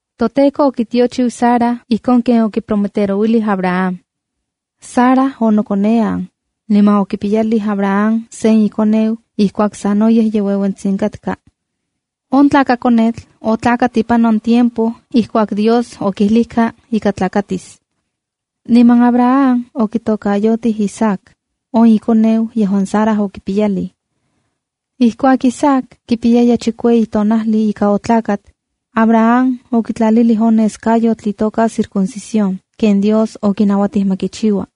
ToTEKO okitiochiu Sara ijkon ken okiprometerouilij Abraham. Sara onokonean, niman okipiyalij Abraham sen ikoneu ijkuak sanoyej ye ueuentsitsin katka. On tlakakonetl otlakat ipan on tiempo ijkuak Dios okijlijka ika tlakatis. Niman Abraham okitokayotij Isaac, on ikoneu yejuan Sara okipiyalij. Ijkuak Isaac kipiyaya chikueyi tonajli ika otlakat, Abraham okitlalilij on neskayotl itoka circuncisión ken Dios okinauatij ma kichiua.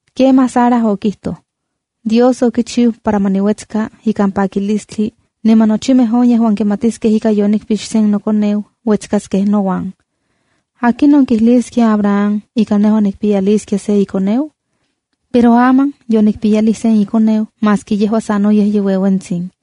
Kemaj Sara okijtoj: “Dios okichiu para ma niuetska ikan pakilistli, niman nochimej on yejuan kimatiskej ika yonikpix sen nokoneu uetskaskej nouan. ¿Akinon kijliskia Abraham ika nejua nikpiyaliskia se ikoneu? Pero aman yonikpiyalij sen ikoneu maski yejua sanoyej ye ueuentsin.”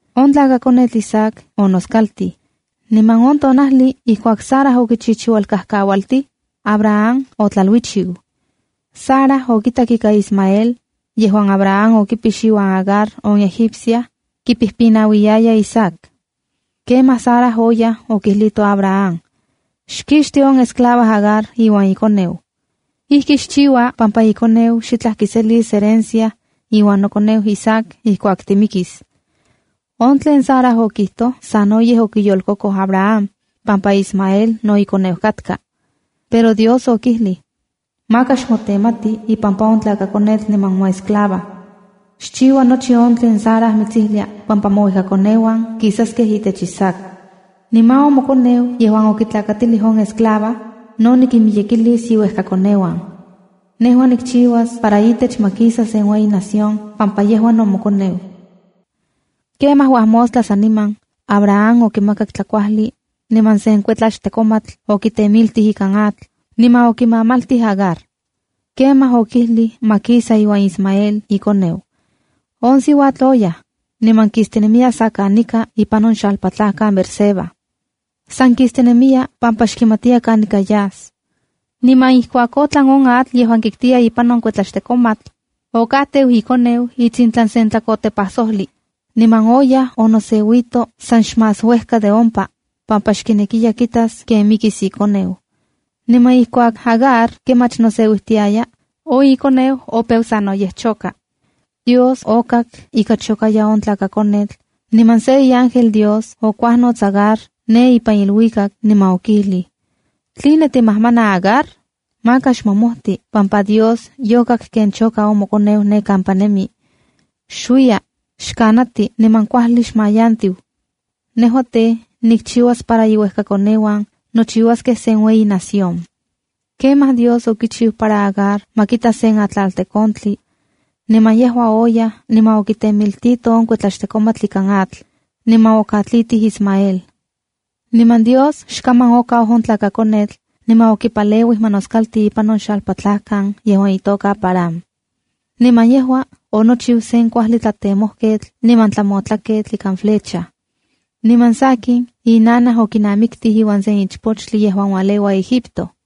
On tlakakonetl Isaac onoskaltij, niman on tonajli ijkuak Sara okichichiualkajkaualtij, Abraham otlaluichiu. Sara okitak ika Ismael, yejuan Abraham okipix iuan Agar on Egipcia, kipijpinauiyaya Isaac. Kemaj Sara oyaj okijlito Abraham: “¡Xkixti on esclava Agar iuan ikoneu! Ijki xchiua pampa ikoneu xitlaj kiselis herencia iuan nokoneu Isaac ijkuak timikis.” In tlen Sara okijtoj sanoyej okiyolkokoj Abraham pampa Ismael no ikoneu katka. Pero Dios okijlij: “Maka xmotenmati ipampa on tlakakonetl niman moesclava. Xchiua nochi on tlen Sara mitsijlia pampa mouejkakoneuan kisaskej itech Isaac. Niman on mokoneu yejuan okitlakatilij on esclava, no nikinmiyekilis iuejkakoneuan. Nejua nikchiuas para itech ma kisa sen ueyi nación pampa yejua no mokoneu.” Kemaj uajmostla saniman, Abraham okimakak tlakuajli, niman sen kuetlaxtekomatl okitemiltij ikan atl, niman okimamaltij Agar. Kemaj okijlij ma kisa iuan Ismael ikoneu. On siuatl oyaj, niman kistinemiya sa kanika ipan on xalpatlajkan Beerseba. San kistinemiya pampa xkimatiya kanika yas. Niman ijkuak otlan on atl yejuan kiktiya ipan on kuetlaxtekomatl, okajteu ikoneu itsintlan sen tlakotepajsojli, niman oyaj onoseuito san xmás uejka de ompa, pampa xkinekiya kitas ken mikis ikoneu. Niman ijkuak Agar kemach noseuijtiaya, on ikoneu opeu sanoyej choka. Dios okak ika chokaya on tlakakonetl, niman sen iángel Dios okuajnots Agar ne ipan iluikak, niman okijlij: “¿Tline timajmana Agar? Maka xmomojti pampa Dios yokak ken choka on mokoneu ne kampa nemi. Xuiya, xkanati niman kuajli xmayantiu. Nejua tej, nikchiuas para iuejkakoneuan nochiuaskej sen ueyi nación.” Kemaj Dios okichiu para Agar ma kita sen atlaltekontli. Niman yejua oyaj niman okitemiltito on kuetlaxtekomatl ikan atl, niman okatlitij Ismael. Niman Dios xkaman okau on tlakakonetl, niman okipaleuij ma noskalti ipan on xalpatlajkan yejuan itoka Parán. Niman yejua onochiu sen kuajli tlatemojketl niman tlamotlaketl ikan flecha. Niman sakin, inanaj okinamiktij iuan sen ichpochtli yejuan ualeua Egipto.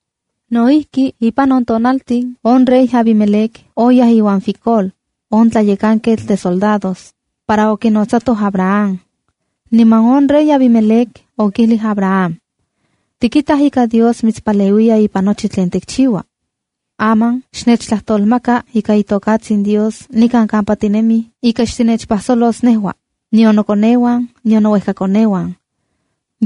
No ijki, ipan on tiempo on rey Abimelec oyaj iuan Ficol, on tlayekanketl de isoldados, para okinotsatoj Abraham. Niman on rey Abimelec okijlij Abraham: —Tikitaj ika Dios mitspaleuiya ipan nochi tlen tikchiua. Aman xnechtlajtolmaka ika itokatsin Dios nikan kampa tinemij ika xtinechpajsolos nejua, nion nokoneuan, nion nouejkakoneuan.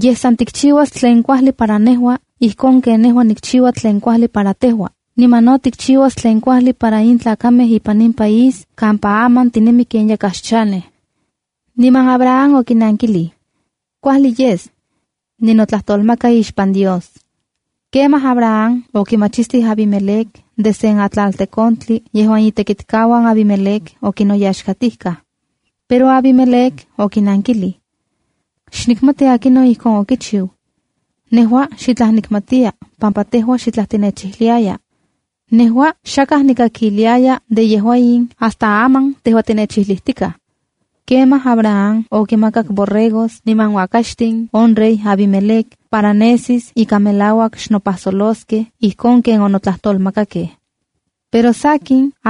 Yej san tikchiuas tlen kuajli para nejua ijkon ken nejua nikchiua tlen kuajli para tejua, niman no tikchiuas tlen kuajli para in tlakamej ipan in país kampa aman tinemi ken yakaj xchanej. Niman Abraham okinankilij: —Kuajli yes. Ninotlajtolmaka ixpan Dios. Kemaj Abraham okimachistij Abimelec de sen atlaltekontli yejuan itekitkauan Abimelec okinoyaxkatijkaj. Pero Abimelec okinankilij: —Xnikmati akinon ijkon okichiu. Nejua xitlaj nikmatiya pampa tejua xitlaj tinechijliaya. Nejua xakaj nikakiliaya de yejua in hasta aman tejua tinechijlitikaj. Kemaj Abraham okimakak borregos niman uakaxtin on rey Abimelec para nesis ika melauak xnopajsoloskej ijkon ken onotlajtolmakakej. Pero sakin,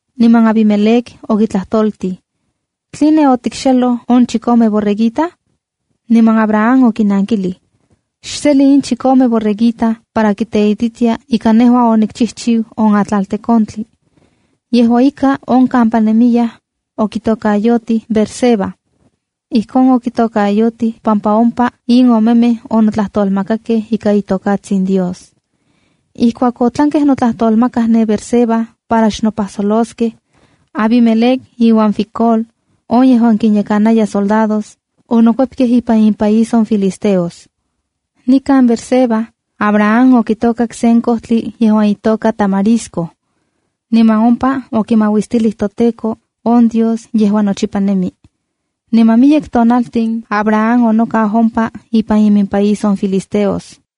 niman Abimelec okitlajtoltij: —¿Tline otikxeloj on chikome borreguita? Niman Abraham okinankilij: —Xseli in chikome borreguita para kiteititia ika nejua onikchijchiu on atlaltekontli. Yejua ika, on kampa nemiyaj, okitokayotijkej Beerseba. Ijkon okitokayotijkej pampa ompa in omemej onotlajtolmakakej ika itokatsin Dios. Ijkuak otlankej notlajtolmakaj ne Beerseba para xnopajsoloskej, Abimelec iuan Ficol, on yejuan kinyekana isoldados, onokuepkej ipan impaís on filisteos. Nikan Beerseba, Abraham okitokak sen kojtli yejuan itoka tamarisco. Niman ompa okimauistilij toTEKO, on Dios yejuan nochipa nemi. Niman miyek tonaltin Abraham onokau ompa ipan iminpaís on filisteos.